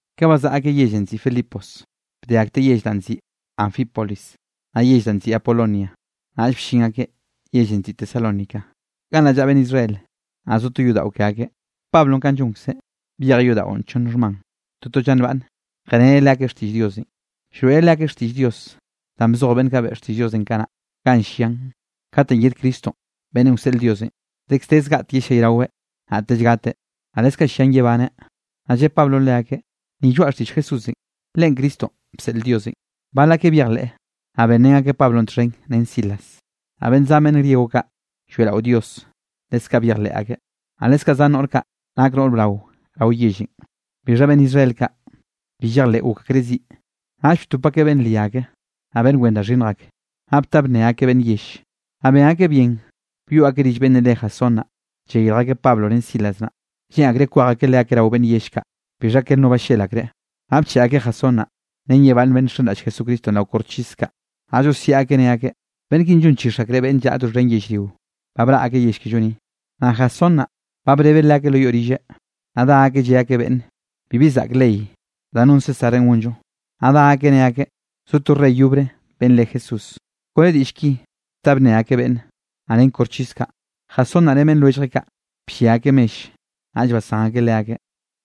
Ka bazaꞌa akeꞌ yellenꞌ nziꞌi Filipos, bde akteꞌ yell danꞌ nziꞌi Anfípolis, naꞌ yell da nziꞌi Apolonia, naꞌll bllin akeꞌ yellenꞌ nziꞌi Tesalónica. Gannaꞌ llaꞌa beꞌnn Israel, naꞌ zo to yodaꞌo ke akeꞌ. Pablonꞌ kanꞌ llonkzeꞌ, byejeꞌ yodaꞌon, chonn xhman toto lla nbaꞌnne, jeꞌreneꞌ leakeꞌ xtiꞌll Diosenꞌ. Llroeꞌreꞌ leakeꞌ xtiꞌll Dios danꞌ bzoj beꞌnn kaꞌ beꞌe xtiꞌll Diosenꞌ kanaꞌ, ganꞌ llian katenꞌ yed Cristo beꞌnnenꞌ wseꞌl Diosenꞌ dekz de zgaꞌtek yellayraweꞌ, naꞌtellenꞌ gateꞌ, naꞌ leskaꞌ llian yebaneꞌ. Naꞌ lle Pablonꞌ leakeꞌ: —Ni lloaꞌ xtiꞌll Jesús, Leꞌen Cristonꞌ bseꞌl Diosenꞌ. Bal akeꞌ byejleꞌ, naꞌ benrén akeꞌ Pablonꞌ txhen ren Silas, naꞌ beꞌnn zan beꞌnn griego kaꞌ, lloeꞌrao Dios, leskaꞌ byejleꞌ akeꞌ, naꞌ leskaꞌ zan noꞌr kaꞌ nak noꞌr brao rao yellenꞌ. Bixha beꞌnn Israel kaꞌ bi llejleꞌ gok akreꞌ ziꞌ, naꞌll btop akeꞌ beꞌnn ria ak, naꞌ beꞌnn wen da xhinnj ak, naꞌ bta bnne akeꞌ beꞌnn yell. Naꞌ ben akeꞌ bien byoꞌ akeꞌ rill beꞌnn re Jasón naꞌ, llayirj akeꞌ Pablo ren Silas naꞌ, lleꞌn akreꞌ kwej akeꞌ leakeꞌ rao beꞌnn yell kaꞌ. Bixha ker no ballel akreꞌ, naꞌ bcheꞌe akeꞌ Jasón naꞌ, ren ye bal beꞌnn kaꞌ nxenraꞌll Jesucristonꞌ rao koxchis kaꞌ, naꞌ llosiaꞌ akeꞌ ne akeꞌ: —Beꞌnn kinꞌ llonchix akreꞌ beꞌnn llaꞌa doxhen yellrio, ba braꞌ akeꞌ yell kello ni. Naꞌ Jasón naꞌ, ba brebeꞌ leakeꞌ lo yoꞌ rilleꞌ, naꞌ dá akeꞌ lle akeꞌ beꞌnn bibi zaꞌk ley danꞌ non Césarenꞌ gonllo, naꞌ dá akeꞌ ne akeꞌ zo to rey yobre beꞌnn re Jesús. Kone diꞌll ki bta bnne akeꞌ beꞌnn, naꞌ ren koxchis kaꞌ. Jasón naꞌ ren beꞌnn lwelljeꞌ kaꞌ, bllia akeꞌ mell, naꞌll basán akeꞌ leakeꞌ.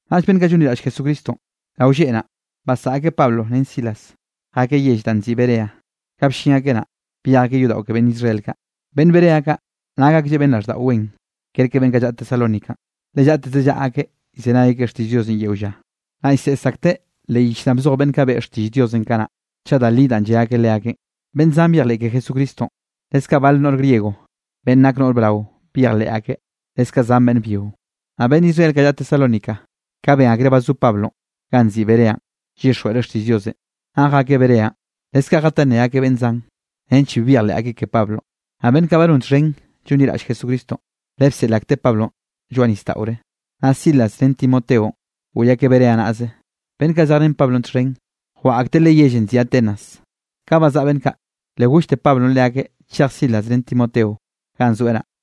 Naꞌll beꞌnn kaꞌ llonliraꞌll Jesucristonꞌ, rao lleꞌ naꞌ, basaꞌa akeꞌ Pablo ren Silas jakeꞌ yell danꞌ nziꞌi Berea. Ka bllin akeꞌ naꞌ, byej akeꞌ yodaꞌo ke beꞌnn Israel kaꞌ. Beꞌnn Berea kaꞌ nak aklleꞌ beꞌnn raꞌlldaꞌo wen kerke beꞌnn kaꞌ llaꞌa Tesalónicanꞌ, le llaꞌteze llaꞌa akeꞌ llzenay akeꞌ xtiꞌll Diosenꞌ yeo lla, naꞌ llseꞌs akteꞌ leꞌ yich danꞌ bzoj beꞌnn kaꞌ beꞌe xtiꞌll Diosenꞌ kanaꞌ, chaꞌ da li danꞌ lle akeꞌ leakeꞌn. Beꞌnn zan byejleꞌ ke Jesucristonꞌ, leskaꞌ bal noꞌr griego beꞌnn nak noꞌr brao byejleꞌ akeꞌ, leskaꞌ zan beꞌnn byio. Naꞌ beꞌnn Israel kaꞌ llaꞌa Tesalónica, ka ben akreꞌ ba zo Pablonꞌ ganꞌ nziꞌi Berea llyixjweꞌreꞌ xtiꞌll Diosenꞌ, naꞌ jakeꞌ Bereanꞌ leskaꞌ jatá nne akeꞌ beꞌnn zan, nench bi byejleꞌ akeꞌ ke Pablonꞌ. Naꞌ beꞌnn kaꞌ ba non txhen llonliraꞌll Jesucristonꞌ, le bseꞌl akteꞌ Pablonꞌ lloaꞌ nisdaꞌore, naꞌ Silas ren Timoteonꞌ goꞌy akeꞌ Berea naꞌze. Beꞌnn kaꞌ zejrén Pablonꞌ txhen, jwaꞌa akteꞌ leꞌe yellenꞌ nziꞌi Atenas. Ka bazaꞌa beꞌnn kaꞌ, le gollte Pablonꞌ leakeꞌ chej Silas ren Timoteo ganꞌ zoeꞌ naꞌ.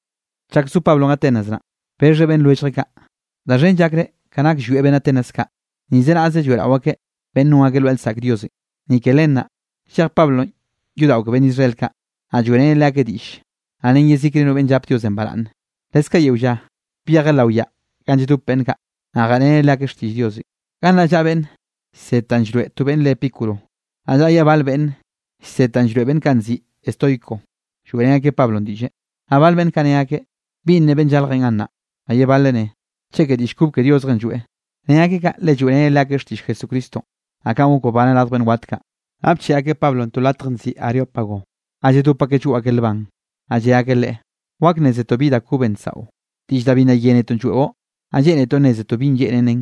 Chak zo Pablonꞌ Atenas naꞌ, bexheꞌ beꞌnn lwelljeꞌ kaꞌ, da xhen llakreꞌ ka nak llwieꞌ beꞌnn Atenas kaꞌ, nize naꞌze lloeꞌrao akeꞌ beꞌnn non akeꞌ lwaꞌa lsaꞌk diosenꞌ. Ni ke len naꞌ, llej Pablonꞌ yodaꞌo ke beꞌnn Israel kaꞌ, naꞌ lloeꞌreneꞌ leakeꞌ diꞌll, naꞌ ren yezikre no beꞌnn llap Diosenꞌ baraꞌnne. Leskaꞌ yeo lla byejeꞌ lao yaꞌa ganꞌ lladop beꞌnn kaꞌ, naꞌ jeꞌreneꞌ leakeꞌ xtiꞌll Diosenꞌ. Gannaꞌ llaꞌa beꞌnn llsed da llroeꞌ to beꞌnn re Epicuro, naꞌ llaꞌa ye bal beꞌnn llsed da llroeꞌ beꞌnn kaꞌ nziꞌi estoico, lloeꞌrén akeꞌ Pablonꞌ diꞌlle. Naꞌ bal beꞌnn kaꞌ ne akeꞌ: —¿Binꞌ ne beꞌnn llaljenꞌ gannaꞌ? Naꞌ ye bale ne: —Cheke diꞌll kob ke diosjenꞌ lloeꞌ. Ne akeꞌ kaꞌ, le lloeꞌreneꞌ leakeꞌ xtiꞌll Jesucristonꞌ, naꞌ kanꞌ gok babaneꞌn radj beꞌnn wat kaꞌ. Naꞌ bcheꞌe akeꞌ Pablonꞌ to latj nziꞌi Areópago ga lladop akeꞌ llgoꞌ akeꞌ lban, naꞌ lle akeꞌ leꞌe: —¿Wak nnézetoꞌ bi da kobenꞌ nsaꞌo? Diꞌll da bi nna yénetoꞌn lloeꞌo, naꞌ lleꞌnetoꞌ nnézetoꞌ bi lleꞌnen nnen.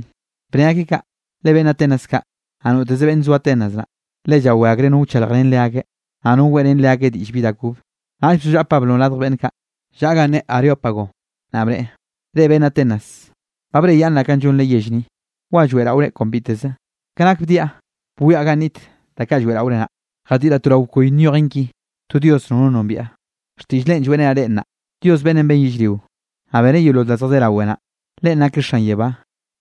Bne akeꞌ kaꞌ, le beꞌnn Atenas kaꞌ, naꞌ noteze beꞌnn zo Atenas naꞌ, le llawé akreꞌ no wchaljrén leakeꞌ, naꞌ no weꞌrén leakeꞌ diꞌll bi da kobe. Naꞌll bzollaꞌa Pablonꞌ radj beꞌnn kaꞌ llaꞌa ganꞌ ne Areópago, naꞌ bneꞌe: —Reꞌ beꞌnn Atenas, ba breꞌyaꞌnnraꞌ kanꞌ llonre yell ni, wa lloeꞌraore kon biteze. Ka nak bdiaꞌ bwiaꞌ ganꞌ niꞌt da kaꞌ lloeꞌraore naꞌ, jadiꞌraꞌ to rao bkoy nyojen ki: “To dios nono nombiaꞌ.” Xtiꞌll Leꞌen lloeꞌrenaꞌ reꞌ nnaꞌ. ’Dios beꞌnnenꞌ ben yellrio, naꞌ beneꞌ yeolol da zjadé rawe naꞌ, Leꞌen nakeꞌ xan yebá,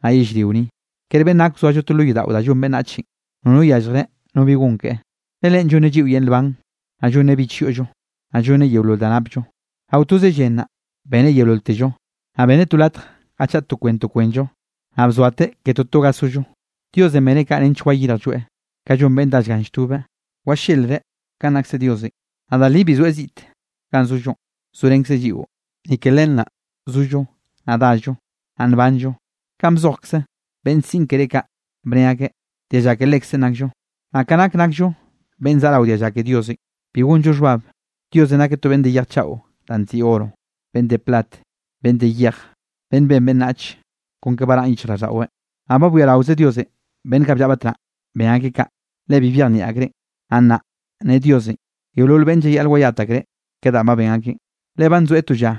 naꞌ yellrio ni, ker beꞌnn gak wzoallo to lo yodaꞌo da llon beꞌnnachenꞌ. Nono llyalljreꞌ no bi gon keꞌe, le Leꞌen llonneꞌ lliꞌo yel nban, naꞌ llonneꞌ bich yoꞌllo, naꞌ llonneꞌ yeolol da napllo. ’Rao toze llen naꞌ, beneꞌ yeololtello, naꞌ beneꞌ to latj ga chaꞌa to kwen to kwenllo, naꞌ bzoateꞌ ke toto ga sollo. Diosenꞌ beneꞌ kaꞌ nench wayirjlloeꞌ, ka llon beꞌnn dá llgan lltobeꞌ, wallelreꞌ kanꞌ nakse Diosenꞌ, naꞌ da li bi zoeꞌ ziꞌte ganꞌ zollonꞌ, zorenkzeꞌ lliꞌo. Ni ke Leꞌen naꞌ, zollo, naꞌ dallo, naꞌ nbanllo, kanꞌ bzojkze beꞌnn siꞌn keré kaꞌ, bne akeꞌ: “Dialla ke Lekzeꞌn nakllo.” Naꞌ ka nak nakllo beꞌnn zaꞌa rao dialla ke Diosenꞌ, bi gonllo xhbab Diosenꞌ nakeꞌ to beꞌnn de yej chaꞌo danꞌ nziꞌi oro, beꞌnn de plat, beꞌnn de yej, beꞌnnenꞌ ben beꞌnnachenꞌ kon ka baraꞌn yichjraꞌlldaꞌweꞌ. Naꞌ ba bwiaraoze Diosenꞌ beꞌnn kaꞌ bllaꞌa batnaꞌ ben akeꞌ kaꞌ, le bi byejnieꞌ akreꞌn. Naꞌ nnaꞌ ne Diosenꞌ yeolol beꞌnne llayaꞌl wayat akreꞌ ke danꞌ ben akeꞌn. Le ba nzoeꞌ to lla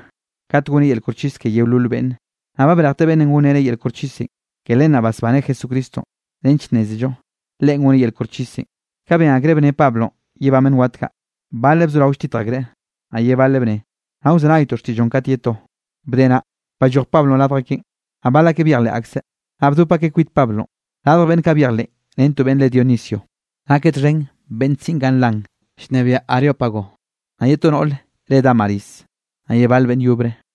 kat goneꞌ yel koxchis ke yeolol beꞌnne, naꞌ ba brejteꞌ beꞌnnenꞌ gonreneꞌ yel koxchisenꞌ, ke len naꞌ basbaneꞌ Jesucristonꞌ nench nnézello Leꞌen goneꞌ yel koxchisenꞌ. Ka ben akreꞌ bne Pablonꞌ yebán beꞌnn wat kaꞌ, baleꞌ bzorao lltitj akreꞌ, naꞌ ye baleꞌ bne: —Nnaꞌ wzenaytoꞌ xtiꞌlloꞌn kat ye to. Bde naꞌ, balloj Pablonꞌ radj akeꞌn. Naꞌ bal akeꞌ byejleꞌ akseꞌ, naꞌ bdop akeꞌ kwit Pablonꞌ. Radj beꞌnn kaꞌ byejleꞌn ren to beꞌnn re Dionisio, nakeꞌ txhen beꞌnn siꞌn kaꞌ nlan llnebiaꞌ Areópago, naꞌ ye to noꞌr re Dámaris, naꞌ ye bal beꞌnn yobre.